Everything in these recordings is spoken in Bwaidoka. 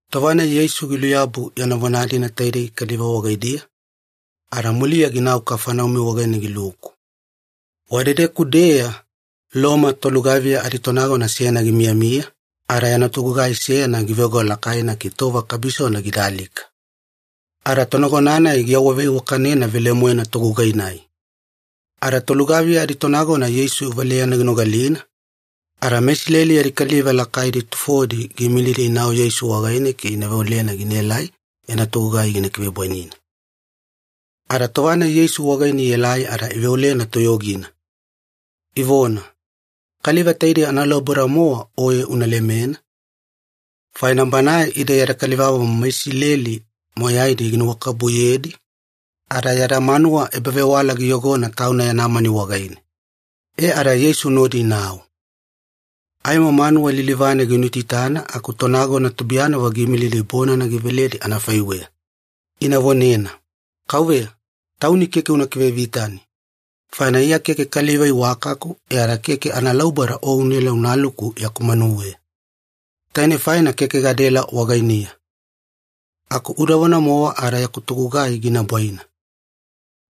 Tova-nai Yeisu giluyabu yana vona-dina taidei kaliva wagaidiya, ada muliya ginau Kafaneumi wagaine giluku. Wadedeku-deya Loma tolugaviya aditonagona seyana gimiyamiya, ada yana togugai seyana giveoga lakaina ke tova kabisona gida alika. Ada tonagona-nai giawaveiwakanena velemoena togugai-nai. Ada tolugaviya aditonagona Yeisu valeyana ginogalina, ada meIsileli yadi kaliva lakaidi tufodi giimilidi inau Yeisu wagaine ke ina veolena ginaelai yana togugai gina kivebwainina. Ada tova-nai Yeisu wagaine ielai ada iveolena toyogina, ivona, “Kaliva taidei analauboda-mowa oye una lemena, faina banae ide yada kalivamomo meIsileli moyaidi ginuwakabubuyedi, ada yada manuwa ebavewala giyogona tauna yana mani wagaine.” E ada Yeisu nodi inau. Aimo manuwa lilivane ginuitaitana aku tonagona tubuiyanavo giimilidi bonana giveledi anafaiweya, ina vonena, “Kauveya, Tauni keke una kivevitani, faina Iya keke kaliva iwakaku e ada keke analauboda o unaela unaluku yaku manuweya. Tainei faina keke gadaela wagainiya. Aku udavona-mowa ada yaku togugai gina bwaina.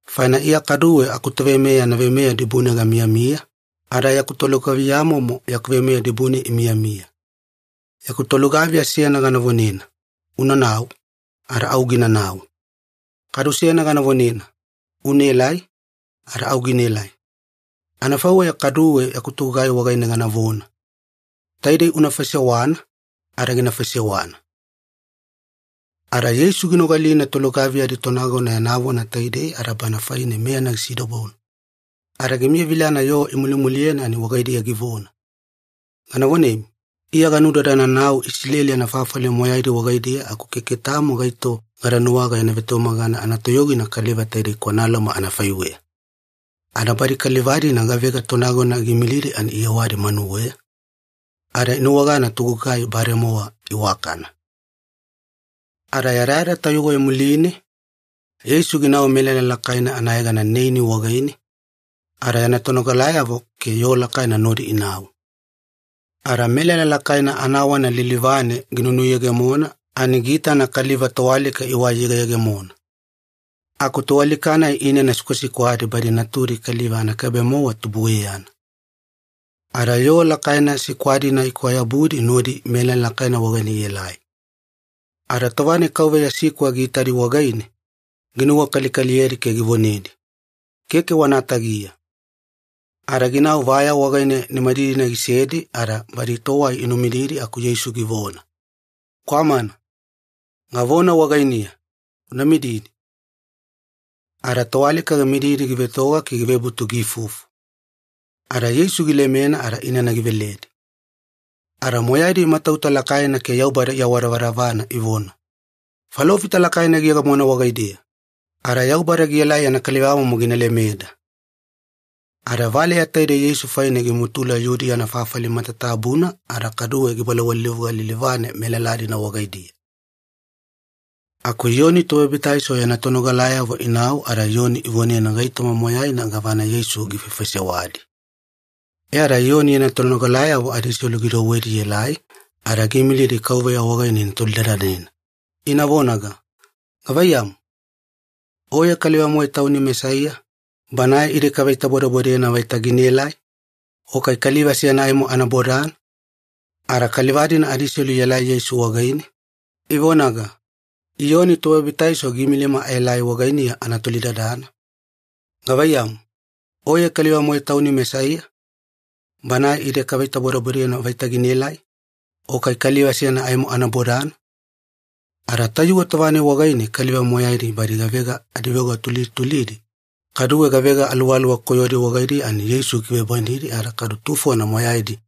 Faina Iya kaduwe akutoveimeya yana veimeya dibune gamiyamiya, ada yaku tolugaviyamomo yaku veimeya dibune imiyamiya. Yaku tolugaviya seyana gana vonena, ‘Unanau,’ ada au ginanau. Kadu seyana gana vonena, ‘Unaelai,’ ada au ginaelai. Anafaiweya kaduwe yaku togugai wagaine ganavona, ‘Taidei una faisewana,’ ada gina faisewana.” Ada Yeisu ginogalina tolugaviya aditonagona yana vona taidei ada bana faine meyana gisidobona, ada gimiyavilana yoo imulimuliyena ani wagaidiya givona, “Gana vonemi, Iya ganudadananau Isileli anafafali moyaidi wagaidiya aku keke tamo gaito gada nuwaga yana vetumagana anatoyogina kaliva taide kwana Loma anafaiweya.” Ada badi kaliva-dina gavega tonagona giimilidi ani iyewadi manuweya, ada inuwagana togugai bademowa iwakana. Ada yadayada tayuwe muline, Yeisu ginau melala lakaina anayegana Neini wagaine, ada yana tonogalayavo ke yoo lakaina nodi inau. Ada melala lakaina anawana lilivane ginunuyegemona ani giitana kaliva toalika iwai iyegeyegemona. Aku toalika-nai inana sikwasikwadi badi natudi kaliva anakaibe-mowa tubueyana. Ada yoo lakaina sikwa-dina ikwayabudi nodi melala lakaina wagaine ielai. Ada tova-nai Kauveya sikwa giitadi wagaine, ginuwakalikaliyedi ke givonedi, “Keke wana tagiya.” Ada ginau vaya wagaine nimadidina gisedi ada badi towai inumididi aku Yeisu givona, “Kwamana, gavona wagainiya, una mididi.” Ada toalika gimididi givetoga ke givebutu giifufu, ada Yeisu gilemena ada inana giveledi. Ada moyaidi imatauta lakaina ke Yaubada iawadavadavana ivona, “Falofita lakaina giyegemona wagaideya!” ada “Yaubada gielai yana kalivamomo gina lemeda.” Ada valeya taidei Yeisu faine gimutula Yudiya anafafali matatabuna ada kaduwe gibalawalilivuga lilivane melala-dina wagaidiya. Aku Iyoni Tobabitaiso yana tonogalayavo inau ada Iyoni ivonena gaitoma moyaina gavana Yeisu gifaifaisewadi. E ada Iyoni yana tonogalayavo adiselu gidouwedi ielai ada giimilidi Kauveya wagaine ina tolidadanena, ina vonaga, “Gavaiyamu, Oye kaliva-moe Tauni Mesaiya, Banae ide kaveitabodebodena vaita ginaelai? O kai kaliva seyana aimo ana bodana?” Ada kaliva-dina adiselu ielai Yeisu wagaine, ivonaga, “Iyoni Tobabitaiso giimilima aelai wagainiya ana tolidadana, ‘Gavaiyamu, Oye kaliva-moe Tauni Mesaiya, Banae ide kaveitabodebodena vaita ginaelai? O kai kaliva seyana aimo ana bodana?’” Ada tayuwe tova-nai wagaine kaliva moyaidi badi gavega adiveoga tulidi tulidi, kaduwe gavega aluwaluwa koyodi wagaidiya ani Yeisu gikivebwainidi ada kaduwe tufona moyaidi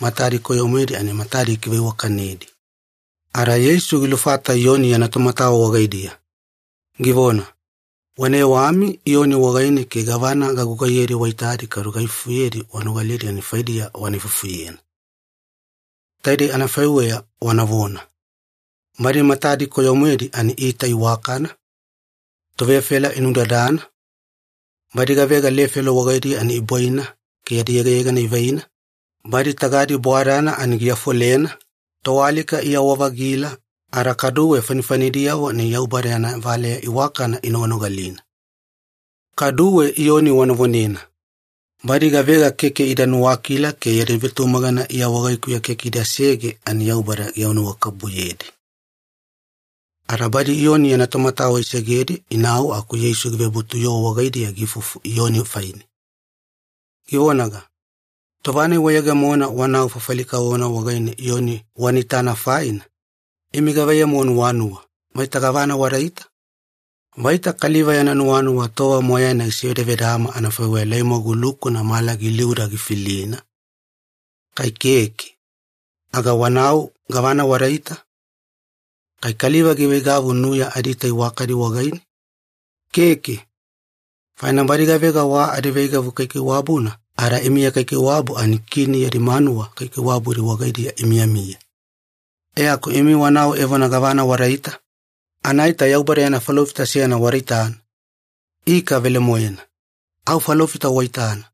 matadi koyo-moedi ani matadi gikiveiwakanedi. Ada Yeisu gilufata Iyoni yana tomatawa wagaidiya, givona, “Wana yewami Iyoni wagaine ke gavana gagugaiyedi waitadi kadu gaifufuyedi wanogalidi ani faidiya wana ifufuyena. Taidei anafaiweya wanavona, ‘Badi matadi koyo-moedi ani iita iwakana, tovefela inunudadana, badi gavega lefelo wagaidiya ani ibwaina ke yadi yegayegana ivaina, badi tagadi bwadana ani giafolena, toalika iyawa-vagila, ada kaduwe fanifanidiyavo ani Yaubada yana valeya iwakana inoganogalina.’ Kaduwe Iyoni wana vonena, ‘Badi gavega keke ida nuwakila ke yadi vetumagana Iya wagaikuya keke idasege ani Yaubada giawanuwakabubuyedi.’” Ada badi Iyoni yana tomatawa isegedi inau aku Yeisu givebutu yoo wagaidiya giifufu Iyoni faine, givonaga, “Tova-nai wayegemona wanau fafali kavovona wagaine Iyoni wana itana faina, imi gavaiyamu wanuwanuwa, vaita gavana wadaita? Vaita kaliva yana nuwanuwa tova moyaina gisevedavedama anafaiweya laimwagu lukuna mala giliuda gifilina? Kai keke, aga wanau gavana wadaita? Kai kaliva giveigavu nuya adiita iwakadi wagaine? Keke, faina badi gavega wa adiveigavu kaikaiwabuna ada imiya kaikaiwabu ani kini yadi manuwa kaikaiwabudi wagaidiya imiyamiya. E aku imi wanau evona gavana wadaita? Anaita Yaubada yana falofita seyana wada itana? Ika velemoena, au falofita waitana,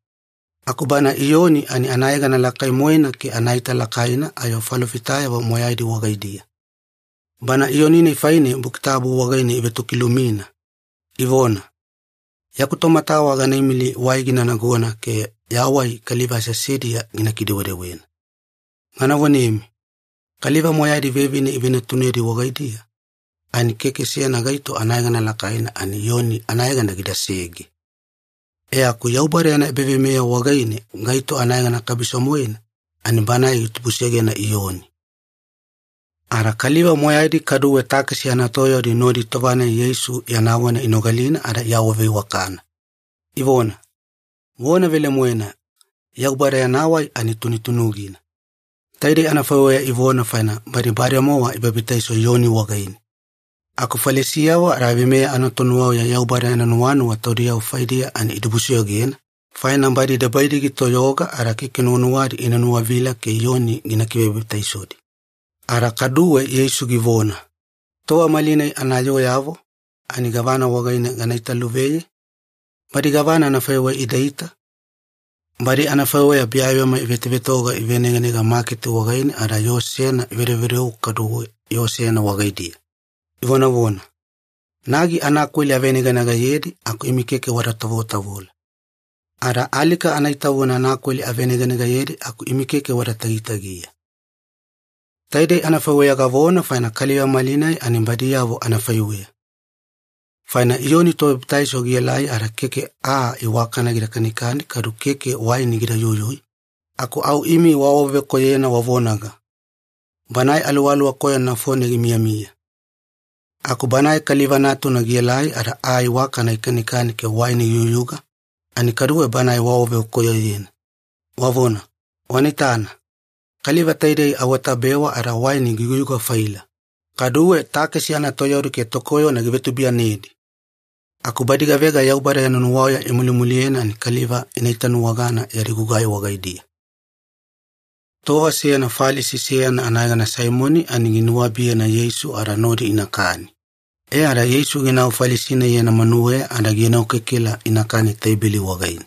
aku bana Iyoni ani anayegana lakai-moena ke anaita lakaina ayo falofitayavo moyaidi wagaidiya. Bana Iyoni-nai faine Buki Tabu wagaine ivetokilumina, ivona, ‘Yaku tomatawa gana imili wai gina nagona ke ya wai kaliva aseasediya gina kidewedewena.’ Gana vonemi, kaliva moyaidi vevine ivenatunedi wagaidiya ani keke seyana gaito anayegana lakaina ani Iyoni anayegana gidasege. E aku Yaubada yana ebaveimeya wagaine gaito anayegana kabiso-moena ani banae gitubusegena Iyoni.” Ada kaliva moyaidi kaduwe takesi anatoyaudi nodi tova-nai Yeisu yana vona inogalina ada iawaveiwakana, ivona, “Vona velemoena Yaubada yana wai ani tunutunugina.” Taidei anafaiweya ivona faina badi bademowa ibabitaiso Iyoni wagaine. Aku Falisiyavo ada veimeya anatonuwauya Yaubada yana nuwanuwa taudiyavo faidiya ani idibusoyogena, faina badi debaidi gitoyoga ada keke nuwanuwadi ina nuwavila ke Iyoni gina kivebabitaisodi. Ada kaduwe Yeisu givona, “Tova malinai anayooyavo ani gavana wagaine gana itaveluveye? Badi gavana anafaiweya adiita? Badi anafaiweya biyabiyama ivetovetoga iveneganega maketi wagaine ada yoo seyana ivedovedou kaduwe yoo seyana wagaidiya, ivonavona, ‘Nagi anakweli aveneganegayedi aku imi keke wada tavotavola. Ada alika anaitavuna anakweli aveneganegayedi aku imi keke wada tagitagiya.’ Taidei anafaiweya gavona faina kaliva malinai ani badiyavo anafaiweya. Faina Iyoni Tobabitaiso gielai ada keke aa iwakana gida kanikani kaduwe keke waini gida yuyui, aku au imi waawavekoyoyena wavonaga, ‘Banae aluwaluwa koyona nafone gimiyamiya.’ Aku Banae Kaliva Natuna gielai ada aa iwakana gikanikani ke waini giyuyuga, ani kaduwe Banae waawavekoyoyena, wavona, ‘Wana itana, kaliva taidei awatabewa ada waini giyugayuga-faila, kaduwe takesi anatoyaudi ke tokoyona givetubuiyanedi!’ Aku badi gavega Yaubada yana nuwauya imulimuliyena ani kaliva ina itanuwagana yadi gugai wagaidiya.” Tova seyana Falisi seyana anayegana Saimoni ani ginuwabiyena Yeisu ada nodi inakani, e ada Yeisu ginau Falisi-nai yana manuweya ada gienokekela inakani teibeli wagaine.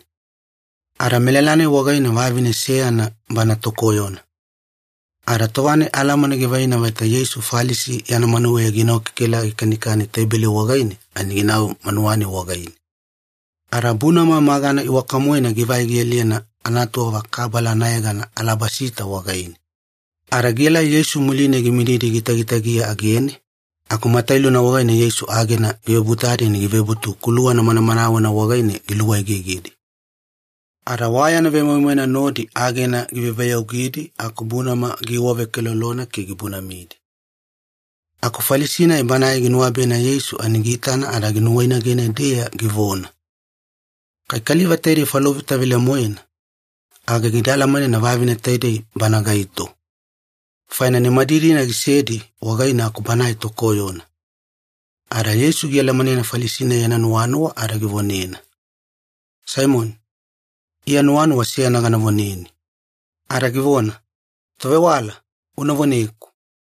Ada melala-nai wagaine vavine seyana bana tokoyona. Ada tova-nai alamana givaina vaita Yeisu Falisi yana manuweya gienokekela gikanikani teibeli wagaine ani ginau manuwa-nai wagaine. Ada bunama magana iwaka-moena givai gialiyena anatuwava kabala anayegana ‘alabasita’ wagaine. Ada gielai Yeisu muline gimididi gitagitagiya agene, aku matailuna wagaine Yeisu agena givebutadi ani givebutu kuluwana manamanawena wagaine giluegegedi. Ada wa yana vemoimoina nodi agena giveyaveyaugidi aku bunama giiwavekelolona ke gibunamidi. Aku Falisi-nai banae ginuwabiyena Yeisu ani giitana ada nuwainagene-deya givona, “Kai kaliva taidei falofita velemoena, aga gida alamanena vavine taidei banae gaito, faina nimadidina gisedi wagaine aku banae tokoyona.” Ada Yeisu gialamanena Falisi-nai yana nuwanuwa ada givonena, “Saimoni, Iya nuwanuwa seyana gana voneni.” Ada givona, “Tovewala, una voneku.”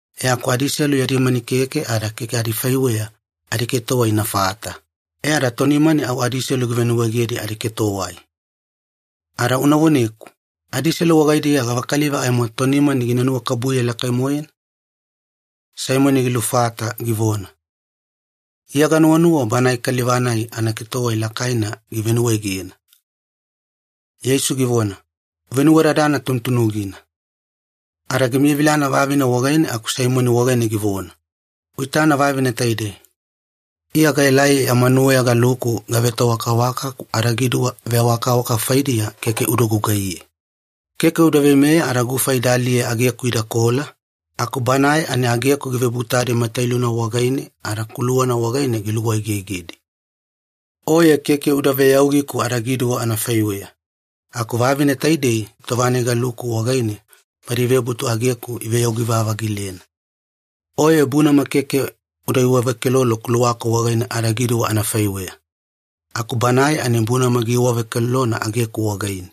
E aku adiselu yadi mani keke ada keke adifaiweya adiketowai inafata, e ada tonimani au adiselu givenuwaegedi adiketowai. Ada una voneku, adiselu wagaidiya gavakaliva aimo tonimani gina nuwakabubuye lakai-moena?” Saimoni gilufata givona, “Iya ganuwanuwa banae kaliva-nai anaketowai lakaina givenuwaegena.” Yeisu givona, “Uvenuwadadana tunutunugina.” Ada gimiyavilana vavine wagaine aku Saimoni wagaine givona, “Uitana vavine taidei. Iya gaelai ya manuweya galuku gavetoawakawaka aku adagiduwa veawakawaka faidiya keke uda gugaiye. Keke uda veimeya ada gufa ida aliye ageku idakola, aku banae ani ageku givebutadi matailuna wagaine ada kuluwana wagaine giluegegedi. Oye keke uda veyaugiku adagiduwa anafaiweya, aku vavine taidei tova-nai galuku wagaine badi ivebutu ageku iveyaugi-vavagilena. Oye bunama keke uda iwavekelolo kuluwaku wagaine adagiduwa anafaiweya, aku banae ani bunama giiwavekelolona ageku wagaine.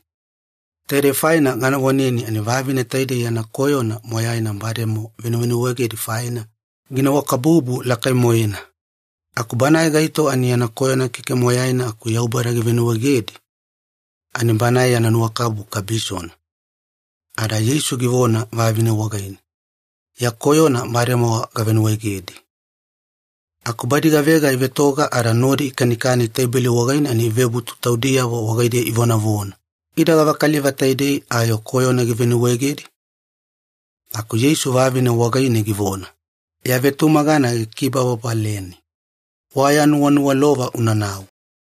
Taidei faina gana voneni ani vavine taidei yana koyona moyaina bademowa venuvenuwaegedi faina, ginuwakabubu lakai-moena. Aku banae gaito ani yana koyona keke moyaina aku Yaubada givenuwaegedi, ani banae yana nuwakabubu kabisona.” Ada Yeisu givona vavine wagaine, “Ya koyona bademowa gavenuwaegedi.” Aku badi gavega ivetoga ada nodi ikanikani teibeli wagaine ani ivebutu taudiyavo wagaidiya ivonavona, “Ida gavakaliva taidei ayo koyona givenuwaegedi?” Aku Yeisu vavine wagaine givona, “Ya vetumagana gikibababaleni. Wa ya nuwaniwalova unanau.”